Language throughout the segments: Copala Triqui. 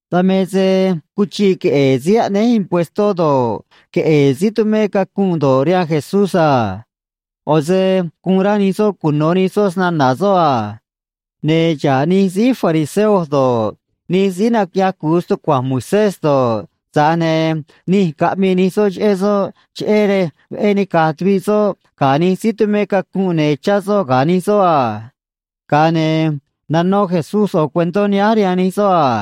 Dan me se cuchiꞌ queꞌe̱e̱ síí aꞌnéj impuestó do̱ꞌ, queꞌe̱e̱ síí tumé cacunꞌ do̱ꞌ, rihaan Jesús a. ꞌO̱ se guun rá nij soꞌ cuno̱ nij soꞌ snana̱ soꞌ a. Ne̱ xa̱ꞌ nij síí fariseo do̱ꞌ, nij síí naquiꞌyaj cu̱u stucua̱nj Moisés do̱ꞌ, tza̱j ne̱ nij caꞌmii nij soꞌ cheꞌé soꞌ, cheꞌé rej veꞌé nica̱j tuviꞌ soꞌ ga̱ nij síí tumé cacunꞌ ne̱ chá soꞌ ga̱ nij soꞌ a. Ga̱a ne̱ nanó Jesús ꞌo̱ cuentó nihánj rihaan nij soꞌ a: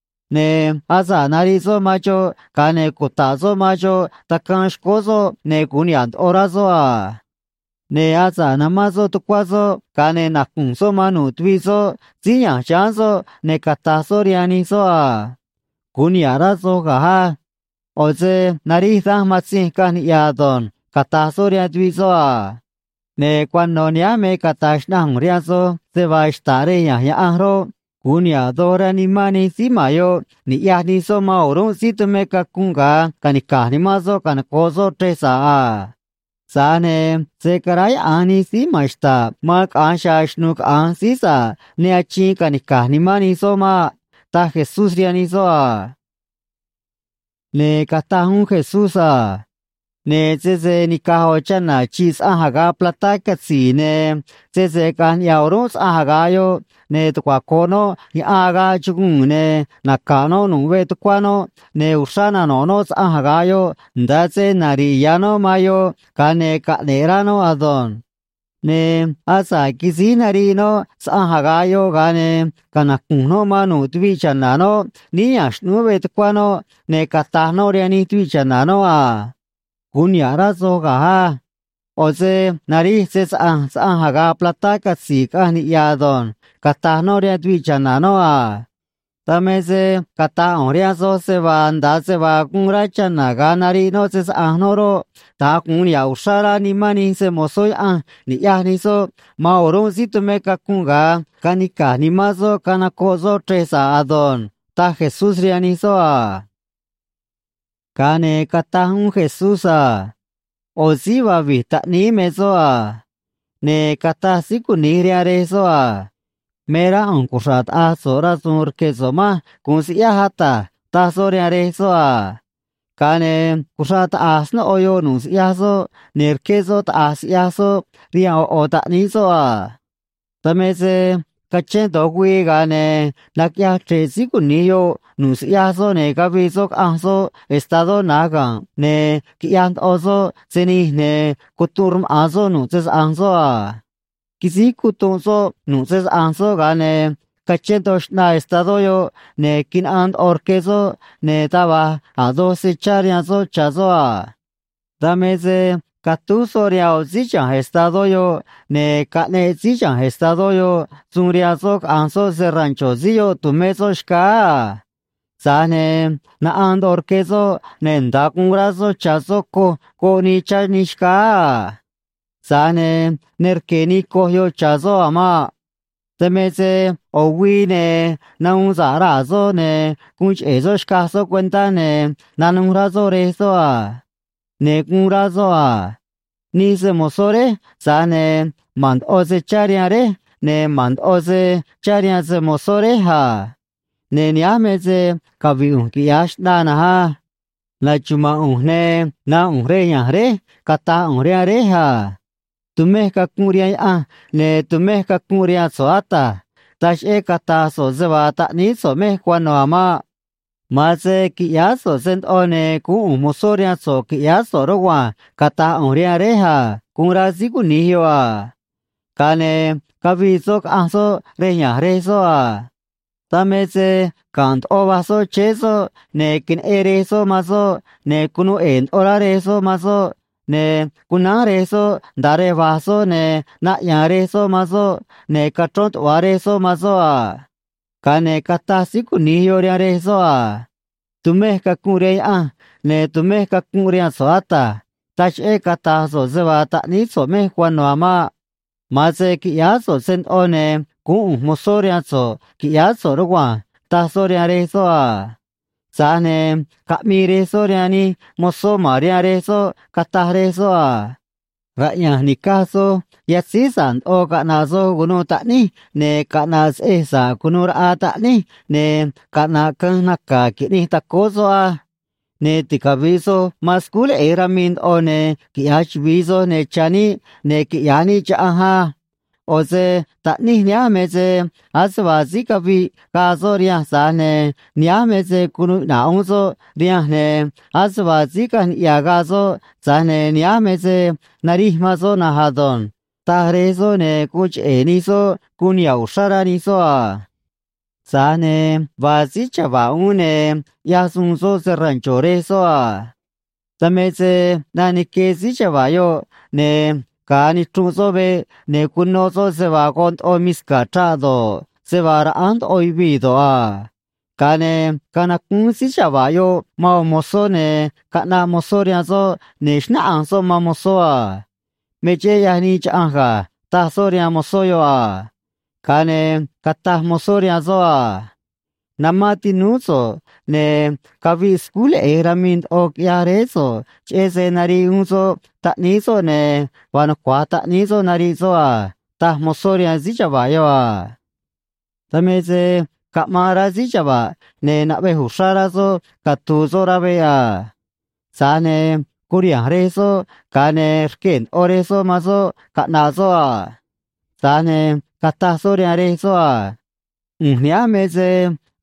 Ne̱ asa̱ꞌ nariꞌ soꞌ man xoꞌ, ga̱a ne̱ cuta̱ꞌ soꞌ man xoꞌ tacaan xcóó soꞌ, ne̱ gu̱un niha̱ꞌ ndoꞌo rá soꞌ a. Ne̱ asa̱ꞌ namán soꞌ tucuá soꞌ, ga̱a ne̱ nacu̱nj soꞌ man nu̱ꞌ tuviꞌ soꞌ síí ya̱nj chiháán soꞌ, ne̱ cata̱j soꞌ rihaan nij soꞌ a: “Gu̱un niha̱ꞌ rá soj ga̱j á. ꞌO̱ se narij danj matzinj caꞌanj niꞌya̱ ado̱nj”, cata̱j soꞌ rihaan tuviꞌ soꞌ a. Ne̱ cuano̱ nihánj me cata̱j xnaꞌanj ꞌu̱nj rihaan soj se vaa xta̱ꞌ rej ya̱nj Yaꞌanj roꞌ, gu̱un niha̱ꞌ doj rá nimán nij síí ma̱n yoꞌ ni̱ꞌyaj nij soꞌ man o̱rúnꞌ síí tumé cacunꞌ ga̱a canica̱j nimán soꞌ canocoꞌ soꞌ chrej sa̱ꞌ a. Tza̱j ne̱ se̱ caráyaꞌa̱nj nij síí ma̱n xta̱ꞌ man caꞌa̱nj chiha̱a̱ xnu̱ꞌ caꞌa̱nj síí sa̱ꞌ ne achiin ca̱nica̱j nimán nij soꞌ maꞌ ―taj Jesús rihaan nij soꞌ a. Ne̱ cataj uún Jesús a: ―Ne̱ sese ni̱caj ꞌo̱ chana̱ chi̱ꞌ saꞌanj aga̱ꞌ platá catzi̱i̱, ne̱ sese caꞌa̱nj niꞌya̱ o̱rúnꞌ saꞌanj aga̱ꞌ yoꞌ, ne̱ tucuaco̱ꞌ noꞌ yaꞌan agaꞌ chuguu̱n, ne̱ naca̱ꞌ noꞌ nu̱ꞌ veꞌ tucuá noꞌ, ne̱ uxrá nano̱ꞌ noꞌ saꞌanj aga̱ꞌ yoꞌ, nda̱a se nari̱ꞌ ya̱ noꞌ man yoꞌ, ga̱a ne̱ caꞌne̱ꞌ rá noꞌ ado̱nj. Ne̱ asa̱ꞌ quisíj nariꞌ noꞌ saꞌanj aga̱ꞌ yoꞌ, ga̱a ne̱ canacu̱nj noꞌ man nu̱ꞌ tuviꞌ cha̱na̱ noꞌ níí ya̱nj xꞌnúú veꞌ tucuá noꞌ, ne̱ cata̱j noꞌ rihaan nij tuviꞌ cha̱na̱ noꞌ a: “Gu̱un niha̱ꞌ rá soj ga̱j á. ꞌO̱ se narij se‑saꞌa̱nj saꞌanj aga̱ꞌ platá catzi̱i̱ caꞌanj niꞌya̱ ado̱nj”, cata̱j noꞌ rihaan tuviꞌ cha̱na̱ noꞌ a. Dan me se cata̱j ꞌu̱nj rihaan soj se vaa nda̱a se vaa guun rá chana̱ ga̱a nariꞌ noꞌ se‑saꞌa̱nj noꞌ roꞌ, da̱nj gu̱un niha̱ꞌ uxrá rá nimán nij se‑mo̱zó Yaꞌanj ni̱ꞌyaj nij soꞌ man o̱rúnꞌ síí tumé cacunꞌ ga̱a canica̱j nimán soꞌ canocoꞌ soꞌ chrej sa̱ꞌ ado̱nj ―taj Jesús rihaan nij soꞌ a. Ga̱a ne̱ cataj uún Jesús a: ―ꞌO̱ síí vaa vi̱j taꞌníí me soꞌ a. Ne̱ cataj síí cuni̱j rihaan rej soꞌ a: “Me rá ꞌu̱nj cuxra̱ꞌ taꞌa̱j so̱ꞌ rasu̱u̱n rque̱ so̱ꞌ manj gu̱un siꞌyáj, ata̱j”, taj soꞌ rihaan rej soꞌ a. Ga̱a ne̱ cuxraꞌ taꞌa̱j snóꞌo yoꞌ nu̱ꞌ siꞌyaj soꞌ, ne̱ rqué soꞌ taꞌa̱j siꞌyaj soꞌ rihaan ꞌo̱ ꞌo̱ taꞌníí soꞌ a. Dan me se cachén do̱j güii, ga̱a ne̱ naquiꞌyaj chre̱ꞌ síí cuni̱j yoꞌ nu̱ꞌ siꞌyaj soꞌ, ne̱ cavii soꞌ caꞌanj soꞌ estadó na̱j ga̱nꞌ, ne̱ quiꞌyaj ndoꞌo soꞌ se nij, ne̱ cutunꞌ rmaꞌa̱n soꞌ nu̱ꞌ se‑saꞌa̱nj soꞌ a. Quisíj cutunꞌ soꞌ nu̱ꞌ se‑saꞌa̱nj soꞌ, ga̱a ne̱ cachén ndoꞌo xꞌnaa estadó yoꞌ, ne̱ quinaꞌaan ndoꞌo rque soꞌ, ne̱ taj va̱j a̱ doj se chá rihaan soꞌ cha̱ soꞌ a. Dan me se catúj soꞌ rihaan ꞌo̱ síí chiha̱nj estadó yoꞌ, ne̱ caꞌneꞌ síí chiha̱nj estadó yoꞌ suun rihaan soꞌ caꞌa̱nj soꞌ se‑rancho̱ síí yoꞌ tu̱mé soꞌ xcáá a. Tza̱j ne̱ naꞌaan ndoꞌo rque soꞌ, ne̱ nda̱a guun rá soꞌ cha̱ soꞌ coj goꞌ nii cha̱ nij xcáá a. Tza̱j ne̱ ne rque̱ nii coj yoꞌ cha̱ soꞌ a̱ maꞌ. ’Dan me se ꞌo̱ güii ne̱ nahuun sa̱ꞌ raa̱ soꞌ, ne̱ guun cheꞌe̱ soꞌ xcaj soꞌ cuentá, ne̱ nanuj rá soꞌ rej soꞌ a. Ne̱ guun rá soꞌ a: “Nij se‑mo̱zó réj, tza̱j ne̱ ma̱n ndoꞌo se chá rihaan réj, ne̱ ma̱n ndoꞌo se chá rihaan se‑mo̱zó réj a. Ne̱ nihánj me se cavi̱ꞌ ꞌu̱nj quiꞌya̱j xꞌnaa na̱nj á. Na̱xuma̱a̱n ꞌu̱nj, ne̱ nánꞌ ꞌu̱nj rej ya̱nj réj, cata̱j ꞌu̱nj rihaan réj a: Tumej cacunꞌ rihaan Yaꞌanj, ne̱ tumej cacunꞌ rihaan so̱ꞌ, ata̱j. Taj cheꞌé cata̱j so̱ꞌ se vaa taꞌníí so̱ꞌ mej cuano̱ a̱ maꞌ. Ma̱an se qui̱ꞌyáá so̱ꞌ se ndoꞌo, ne̱ guún ꞌu̱nj mozó rihaan so̱ꞌ, qui̱ꞌyáá so̱ꞌ, rugua̱nj, cata̱j ꞌu̱nj rihaan réj a”, guun rá síí cuni̱j yoꞌ a. ’Ga̱a ne̱ cavii soꞌ caꞌanj soꞌ rej ya̱nj rej soꞌ a. Dan me se ga̱nꞌ ndoꞌo va̱j soꞌ chéé soꞌ, ne̱ queneꞌen rej soꞌ man soꞌ, ne̱ cunuu ꞌe̱e̱ ndoꞌo rá rej soꞌ man soꞌ, ne̱ cunánj rej soꞌ nda̱a rej va̱j soꞌ, ne̱ naꞌya̱a̱n rej soꞌ man soꞌ, ne̱ cachrón tuꞌva̱ rej soꞌ man soꞌ a. Ga̱a ne̱ cataj síí cuni̱j yoꞌ rihaan rej soꞌ a: “Tumej cacunꞌ rihaan Yaꞌanj, ne̱ tumej cacunꞌ rihaan so̱ꞌ, ata̱j. Taj cheꞌé cata̱j so̱ꞌ se vaa taꞌníí so̱ꞌ mej cuano̱ a̱ maꞌ. Ma̱an se qui̱ꞌyáá so̱ꞌ se ndoꞌo, ne̱ guún ꞌu̱nj mozó rihaan so̱ꞌ, qui̱ꞌyáá so̱ꞌ, rugua̱nj”, taj soꞌ rihaan rej soꞌ a. Tza̱j ne̱ caꞌmii rej soꞌ rihaan nij mozó ma̱n rihaan rej soꞌ, cataj rej soꞌ a: “Raꞌya̱nj ni̱caj soj yatzíj sa̱ꞌ ndoꞌo caꞌna̱ꞌ soj cu̱nuû taꞌníj, ne̱ caꞌna̱ꞌ seꞌej sa̱ꞌ cu̱nuû raꞌa taꞌníj, ne̱ caꞌna̱ꞌ canj naca̱ qui̱ꞌnij tacóó soꞌ á. Ne̱ ticavi̱ꞌ soj man scúj leꞌe̱j ramii ndoꞌo, ne̱ quiꞌya̱j chuvi̱i soj, ne̱ cha̱ níꞌ, ne̱ quiꞌya̱j níꞌ chaꞌanj á. ꞌO̱ se taꞌníj nihánj me se ase vaa síí caviꞌ gaa soꞌ rihanj, tza̱j ne̱ nihánj me se cunuu iꞌna̱ꞌ uún soꞌ rihanj, ne̱ ase vaa síí caꞌanj niꞌya̱ gaa soꞌ, tza̱j ne̱ nihánj me se narij man soꞌ na̱nj ado̱nj”, taj rej soꞌ, ne̱ guun cheꞌe̱ nij soꞌ guun niha̱ꞌ uxrá rá nij soꞌ a. ’Tza̱j ne̱ vaa síí chava̱ꞌ uún, ne̱ ꞌyaj suun soꞌ se‑rancho̱ rej soꞌ a. Dan me se ꞌnaꞌ nique síí chava̱ꞌ yoꞌ, ne̱ ga̱a nichrunꞌ soꞌ veꞌ, ne̱ cuno soꞌ se vaa goꞌ ndoꞌo misca̱ chraꞌ do̱ꞌ, se vaa raꞌánj ndoꞌo yuvii̱ do̱ꞌ a. Ga̱a ne̱ canacúún síí chava̱ꞌ yoꞌ man ꞌo̱ mozó, ne̱ caꞌnaꞌ mozó rihaan soꞌ, ne̱ xnáꞌanj soꞌ man mozó a: “Me cheꞌé ꞌyaj nii chaꞌanj ga̱”, taj soꞌ rihaan mozó yoꞌ a. Ga̱a ne̱ cataj mozó rihaan soꞌ a: “Namán tinúú so̱ꞌ, ne̱ caviꞌ scúj leꞌe̱j ramii ndoꞌo, quiꞌyaj réé so̱ꞌ, cheꞌé se nariꞌ uún soꞌ taꞌníí soꞌ ne̱ vaa nucua̱j taꞌníí soꞌ nariꞌ soꞌ a”, taj mozó rihaan síí chava̱ꞌ yoꞌ a. ’Dan me se caꞌmaan rá síí chava̱ꞌ, ne̱ naꞌvej uxrá rá soꞌ catu̱u̱ soꞌ rá veꞌ a. Tza̱j ne̱ curiha̱nj rej soꞌ, ga̱a ne̱ rquee̱ ndoꞌo rej soꞌ man soꞌ caꞌna̱ꞌ soꞌ a. Tza̱j ne̱ cataj soꞌ rihaan rej soꞌ a: “ꞌU̱nj nihánj me se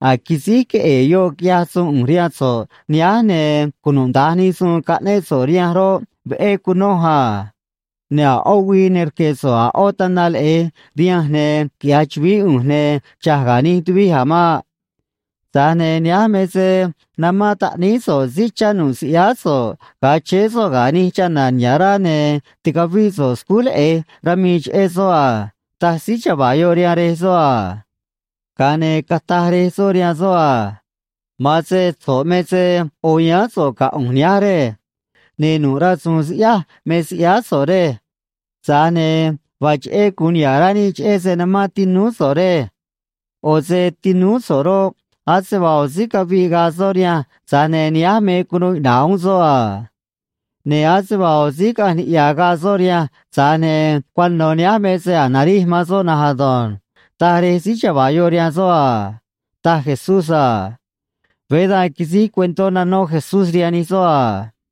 a̱j quisíj queꞌe̱e̱ yoꞌ quiꞌyaj suun ꞌu̱nj rihaan so̱ꞌ nihánj, ne̱ cunuda̱nj nij suun caꞌnéꞌ so̱ꞌ rihanj roꞌ, veꞌé cunoj a. Ne̱ a̱ ꞌó güii ne rque̱ so̱ꞌ a̱ ꞌó tana leꞌe̱j rihanj ne̱ quiꞌya̱j chu̱vií ꞌu̱nj ne̱ cha̱j ga̱ nij tuvij a̱ maꞌ. Tza̱j ne̱ nihánj me se namán taꞌníí so̱ꞌ síí chá nu̱ꞌ siꞌyáá so̱ꞌ ga̱a chéé soꞌ ga̱ nij chana̱ niha̱ꞌ rá, ne̱ ticavíꞌ so̱ꞌ scúj leꞌe̱j ramii cheꞌé soꞌ a”, taj síí chava̱ꞌ yoꞌ rihaan rej soꞌ a. ’Ga̱a ne̱ cataj rej soꞌ rihaan soꞌ a: “Ma̱an se so̱ꞌ me se ꞌo̱ yáán so̱ꞌ ga̱ ꞌu̱nj nihánj, rej. Ne̱ nu̱ꞌ rasu̱u̱n siꞌyáj me siꞌyáá so̱ꞌ, rej. Tza̱j ne̱ vaa cheꞌé gu̱un niha̱ꞌ rá níꞌ cheꞌé se namán tinúú so̱ꞌ, rej. ꞌO̱ se tinúú so̱ꞌ roꞌ, ase vaa ꞌo̱ síí caviꞌ gaa soꞌ rihanj, tza̱j ne̱ nihánj me cunuu iꞌna̱ꞌ uún soꞌ a. Ne̱ ase vaa ꞌo̱ síí caꞌanj niꞌya̱ gaa soꞌ rihanj, tza̱j ne̱ cuano̱ nihánj me se a̱j narij man soꞌ na̱nj ado̱nj”, taj rej síí chava̱ꞌ yoꞌ rihaan soꞌ a ―taj Jesús a. Veé da̱nj quisíj cuentó nanó Jesús rihaan nij soꞌ a.